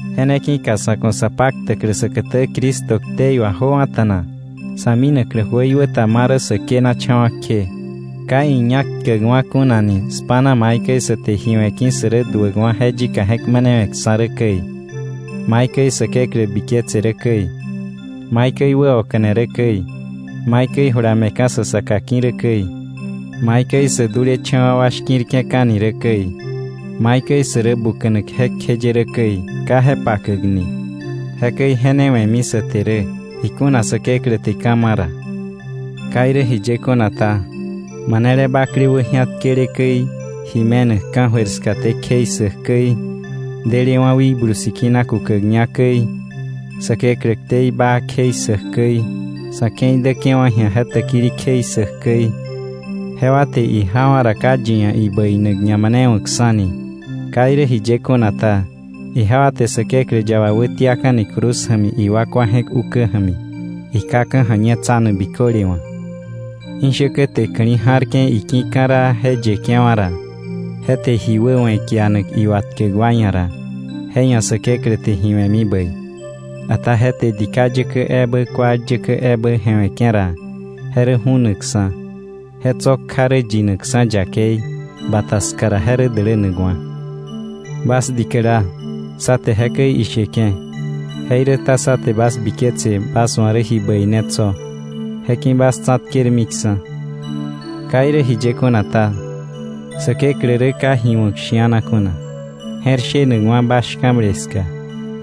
Je ne ki̱ka sa̱ ku̱ sa paktäklä säkätä Cristo ktei wà jöwa̱ta̱na, sa̱ minaklä jöikwä ta ma rä sä kënacha̱wa̱ kje, ka iñak tkäkwa̱ kunani spa̱na maikäi sä te ji we̱ ki̱ sä rä duäkwa̱ je yika je̱k manewe̱ksa̱ rä käi, maikäi Säkeklä biketse rä käi, maikäi wäoka̱ne rä käi, maikäi jula me̱ka̱ sa saka ki̱ rä käi, maikäi sä dulecha̱wa̱ wa shki̱rke̱ka̱ni rä käi, maikäi sä rä buka̱nak jekjeye rä käi ka je pakäkni. Jekäi je ne we̱mi sä te rä, ikuna Säkeklä te ka̱ ma̱ ra. Ka irä jiye kuna ta, manele bakle wäji̱atkele käi, ji me̱nak ka̱jöir skaté kjei ssäk käi, delewa̱ Wikblu Sikina kukäkña käi, Säkeklä ktei baa kjei ssäk käi, sa̱ ke̱i däke̱wa̱ ji̱a je täkili kjei ssäk käi, jewa te ijawa̱ ra, ka yi ia̱ ibäinak ñamanewa̱kksa̱ni. Ka irä jiye kuna ta, ijewa te Säkeklä yaba wätiaka̱ni cruz ja̱mi iwakwa je̱k ukä ja̱mi, ikaka̱ ja̱ñetsanak biköle wa̱. Ishäkä te ka̱li̱ ja̱rke̱ iki̱ ka̱raa je yeke̱wa̱ ra, je te ji wäwe̱ kianak iwatkäk wa ia̱ ra, je ia̱ Säkeklä te ji we̱mi bäi; ata je te dika yäkä ebä kual yäkä ebä je̱we̱ke̱ ra, je rä ju̱nakksa̱, je tso̱ kja rä yinakksa̱ yakei, bata ska ra je rä dälänakwa̱. Bas dikäla, sá te jekäi isheke̱, jeiräta sá te bas biketse bas wa̱ rä ji bäi ne tso̱, je ki̱ bas tsa̱tkermiksa̱. Ka irä jiye kuna ta, Säkeklä rä ka ji wa̱k shi̱ana kuna, je̱r shenakwa̱ bas shka̱ble ska,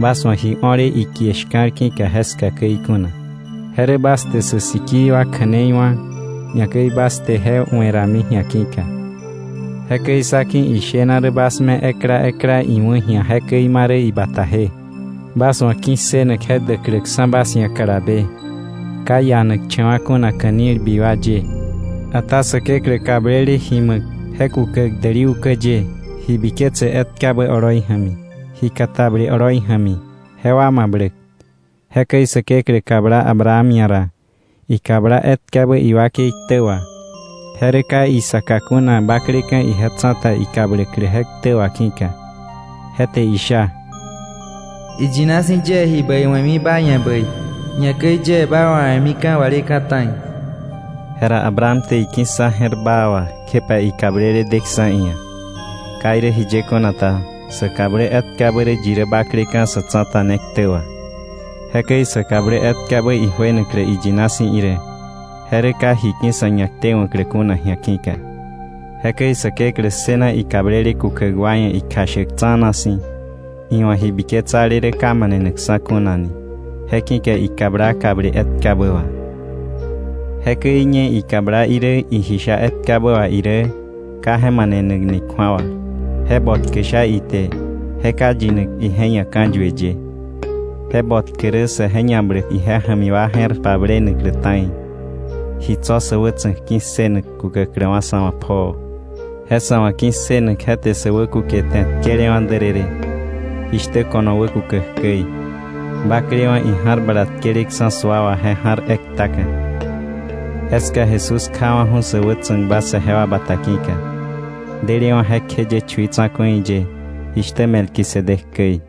bas wa̱ ji o̱le ikie shka̱l ki̱ka jeska käi kuna, je rä bas te sä sikii wa kja̱nei wá̱, ñakäi bas te je we̱rami ji̱a ki̱ka. Jekäi sá ki̱ ishena rä bas me ekla ekla iwa̱k ji̱a jekäi marä ibataje, bas wa̱ ki̱ssënak je däkläksa̱ bas ia̱ kalabe, ka ianakcha̱wa̱ kuna ka̱nilbi wa ye, ata Säkeklä kablele ji ma̱k je kukäk däli ukä ye ji biketse etkabä oloi ja̱mi, ji katable oloi ja̱mi jewa mabläk. Jekäi Säkeklä kabla Abraham ia̱ ra, ikabla etkabä iwakei ktä wà, je rä ka isaka kuna bakleka̱ ije tsa̱ta ikabläklä je ktä wà ki̱ka. Je te isha: “Iyina si̱ yie ji bäi we̱mi ba ia̱ bäi, ñakäi yie ba wawe̱mika̱ waleka̱ ta̱i.” Jera Abraham te iki̱ssa je̱r baa wà, kjepa ikablele deksa̱ iia̱. Ka irä jiye kuna ta, sa kablä etkabä rä yi rä bakleka̱ sa̱ tsa̱ta ne ktä wà. Jekäi sa kablä etkabä ijuenaklä iyina si̱ irä, je rä ka ji ki̱ sa̱ ñaktewa̱klä kuna ji̱a ki̱ka. Jekäi Säkeklä ssëna ikablele kukäk wa ia̱ ikjashäk tsa̱na si̱, iwa̱ ji biketsale rä ka manenakksa̱ kuna ni. Je ki̱ka ikabla kable etkabä wà. Jekäi ñe ikabla irä iji sha etkabä wà irä, je ka manenakni kju̱awa, je botkä sha ite je ka yinak ije ia̱ ka̱yue ye, je botkä rä saje ñabläk ije ja̱mi wa je̱r pablenaklä ta̱i, ji tso̱ sä wätsa̱k ki̱ssënak kukäkläwa̱ sa̱ wa̱ pjoo. Je sa̱ wa̱ ki̱ssënak je te sä wäkukete tkelewa̱ därërë, jishtä ko̱no wäkukäk käi, baklewa̱ ija̱r bala tkeleksa̱ sua wà je ja̱r ektaka, jeska Jesús kjawa̱ju̱ sä wätsa̱kba saje wa bata ki̱ka, delewa̱ jekjeye chui tsa̱ku̱i ye, jishtä Melquisedec käi.